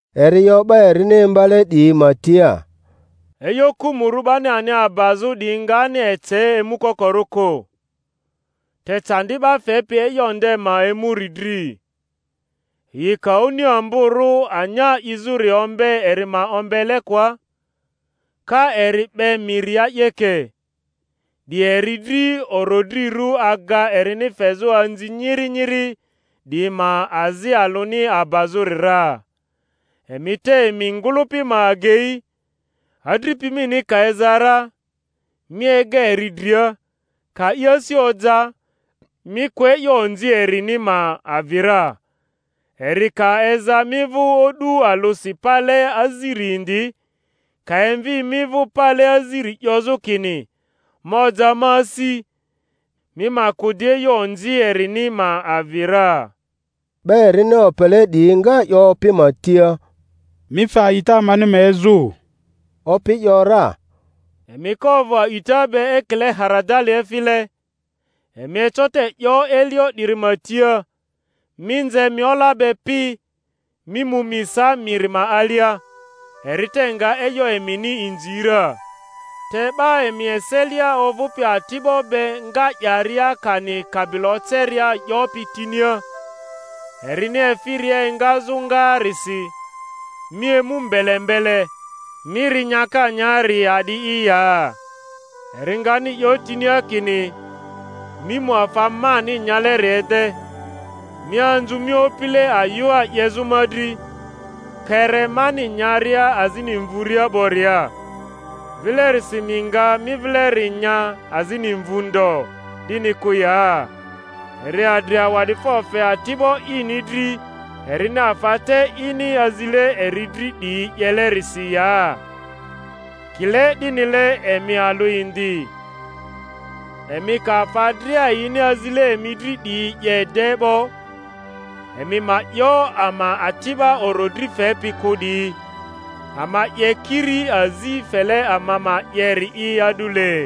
Eri 'yo 'ba erini imbale 'diyi ma tia, E'yo kᴜmᴜrᴜ 'bani ani abazᴜ 'diyi ngani ece emukokorᴜ kᴜ; te candi 'ba fepi e'yo nde ma emuri dri! Yi ka oni amborᴜ anya 'izᴜri ombe eri ma ombelekoa, ka eri 'be miria 'yeke, 'di eri dri orodrirᴜ aga erini fezᴜ anzi nyiri nyiri 'diyi ma azi alᴜni abazᴜri ra. Emi te emi ngᴜlᴜpi ma agei; adripi mini ka eza ra, mi ega eri dria, ka i asi oja, mi kᴜ e'yo onzi erini ma avi ra. Eri ka eza mi vᴜ o'du alᴜsi pale aziri indi, ka emvi mi vᴜ pale aziri 'yozᴜ kini, Ma oja ma asi; mi ma kᴜ di e'yo onzi erini ma avi ra. 'Ba erini opele 'diyi nga 'yo Opi ma tia, Mi fe a'ita amani ma ezᴜ! Opi ‘yora, Emi ka ovᴜ a'ita be ekile haradali efile, emi eco te 'yo elio 'diri ma tia, Mi nze mi ola be pi, mi mu mi sa miri ma alia; eri te nga e'yo emini inzi ra. Te 'ba emi eselia ovᴜpi ati'bo be nga 'yaria kani kabilo oceria 'yopi tinia, erini efiria engazᴜ ngaarisi, Mi emu mbele mbele, mi ri nyaka nya-ri a'di'i ya? Eri ngani 'yo tinia kini, Mi mu afa mani nyaleri ede, mi anzu mi opile ayᴜa 'yezᴜ ma dri, kpere mani nyaria azini mvuria 'boria; vilerisi mi nga mi vileri nya azini mvᴜ ndo—'dini kᴜ ya? Eri adri awa'difo fe ati'bo ini dri erini afa te ini azile eri dri 'diyi 'yelerisi ya? Kile 'dinile emi alᴜ indi, emi ka afa dria yini azile emi dri 'diyi 'ye de 'bo, emi ma 'yo, Ama ati'ba orodri fepi kᴜ 'diyi, ama 'ye kiri azi fele ama ma 'yeri'i a'dule.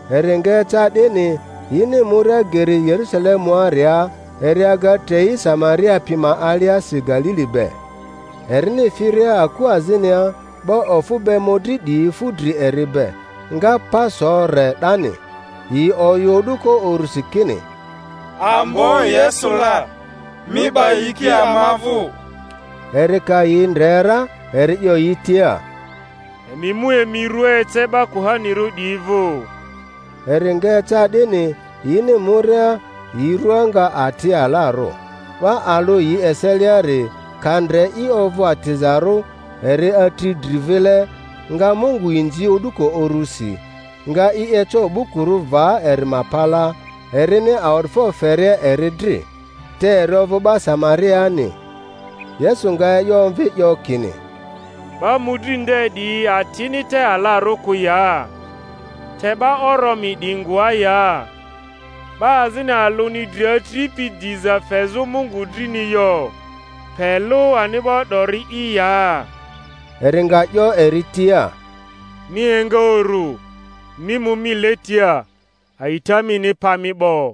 Eri nga eca 'dini, yini muria geri Yerusalemuaria, eri aga trei Samaria pi ma aliasi Galili be. Erini firia aku azinia, 'ba ofᴜ be mᴜdri 'diyi fu dri eri be, nga pa so re 'dani, yi oyᴜ o'duko urusi kini, Ambo Yesu la! mi 'ba yiki ama vᴜ. Eri ka yi ndre ra, eri 'yo yi tia, Emi mu emi rua ece 'ba kuhanirᴜ 'diyi vᴜ. Eri nga eca 'dini, yini muria, yi rua nga ati alarᴜ. 'Ba alᴜ yi eseliari, ka ndre i ovᴜ atizarᴜ, eri atri dri vile, nga Mungu inzi o'duko urusi; nga i eco o'bukurᴜ va eri ma palaa, erini awa'difo feria eri dri. Te eri ovᴜ 'ba Samariani. Yesu nga e'yo omvi 'yo kini, 'Ba mᴜdri nde 'diyi atini te alarᴜ kᴜ ya? Te 'ba oromi 'diyi ngoa ya? 'Ba azini alᴜni dri atripi diza fezᴜ Mungu drini yo, pe lᴜ ani'bo 'dori'i ya? Eri nga 'yo eri tia, Mi enga uru, mi mu mi letia; a'ita mini pa mi 'bo.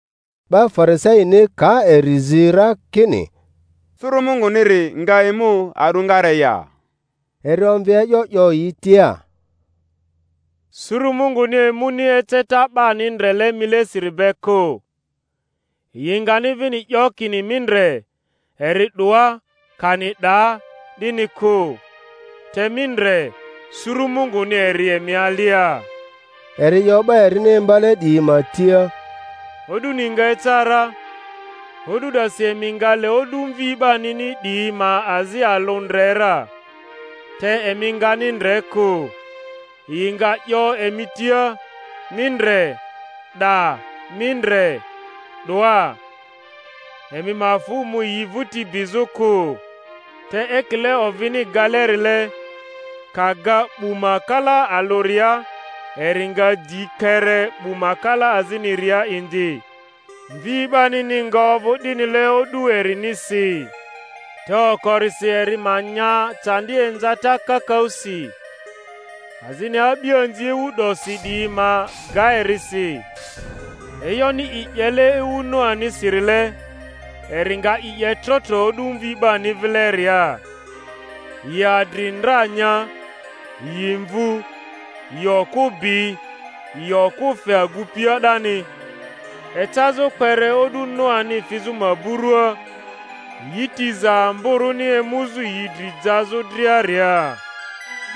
'Ba Farisaini ka eri zi ra kini, Suru Munguniri nga emu a'dᴜngare ya, eri omvi e'yo 'yo yi tia, Suru Munguni emuni eceta 'bani ndrele milesiri be kᴜ; yi ngani vini 'yo kini, Mi ndre, eri 'doa! kani 'Daa!—'dini kᴜ, te mi ndre, suru Munguni eri emi alia. Eri 'yo 'ba erini imbale 'diyi ma tia, O'duni nga eca ra, o'du 'dasi emi nga le o'du Mvi 'banini 'diyi ma azi alᴜ ndre ra, te emi ngani ndre kᴜ. Yi nga 'yo emi tia, Mi ndre, 'daa! Mi ndre, 'doa! Emi ma fᴜ mu yi vᴜti bizᴜ kᴜ. Te ekile ovini galerile, ka ga 'bu ma kala alᴜria eri nga di kpere 'bu ma kala aziniria indi, Mvi 'banini nga ovᴜ 'dinile o'du erinisi. Te okorisi eri ma nya candi inzata kakaᴜsi, azini a'bianzi ewu 'dosi 'diyi ma ga eri si. E'yoni i 'yele ewu Noanisirile, eri nga i 'ye trotro o'du Mvi 'bani vileria. Yi adri ndra nya, yi mvu, yi okᴜ bi, yi okᴜ fe agupia 'dani, ecazᴜ kpere o'du Noani fizᴜ maburua, yi tiza ambo-rᴜni emuzᴜ yi dri jazᴜ driaria.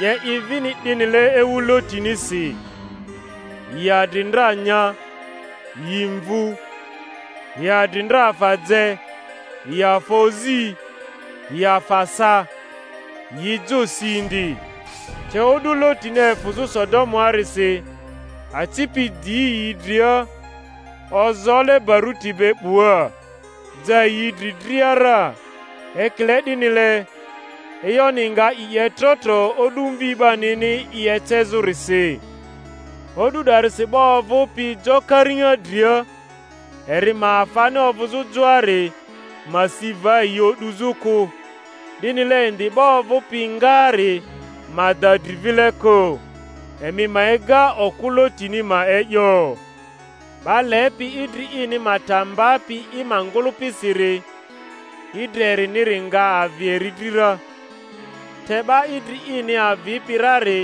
'Ye i vini 'dinile ewu Lotinisi—yi adri ndra nya, yi mvu, yi adri ndra afa je, yi afa ozi, yi afa sa, yi jo si indi, te o'du Lotini efᴜzᴜ Sodo-muarisi, aci pi 'di yi dria ozoole baruti be 'bua, ja yi dri dria ra— ekile 'dinile, e'yoni nga i 'ye trotro o'du Mvi 'banini i ecezᴜrisi. O'du 'darisi 'ba ovᴜpi jo kariŋa dria, eri ma afani ovᴜzᴜ joari, ma si va yi o'duzᴜ kᴜ; 'dinile indi 'ba ovᴜpi ngaari ma da dri vile kᴜ. Emi ma ega okᴜ Lotini ma e'yo. 'Ba lepi idri ini ma ta mbapi i ma ngᴜlᴜpisiri, idri eriniri nga avi eri dri ra, te 'ba idri ini avipi rari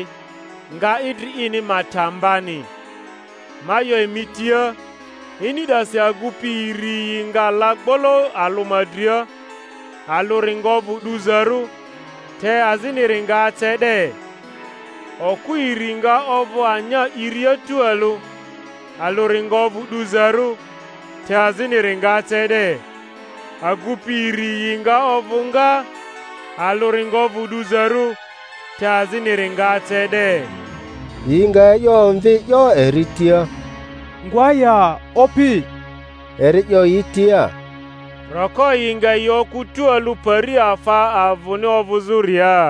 nga idri ini ma ta mbani. Ma 'yo emi tia, ini 'dasi agupi iri yi nga la gbolo alᴜ ma dria; alᴜri nga ovᴜ 'duzarᴜ, te aziniri nga ace 'de. Okᴜ iri nga ovᴜ anya 'iria tualᴜ; alᴜri nga ovᴜ 'duzarᴜ, te aziniri nga ace 'de. Agupi iri yi nga ovᴜ ngaa; alᴜri nga ovᴜ 'duzarᴜ, te aziniri nga ace 'de. Yi nga e'yo omvi 'yo eri tia, Ngoa ya, Opi? Eri 'yo yi tia, Roko yi nga yi okᴜ tualᴜ pari afa avᴜni ovᴜzᴜria.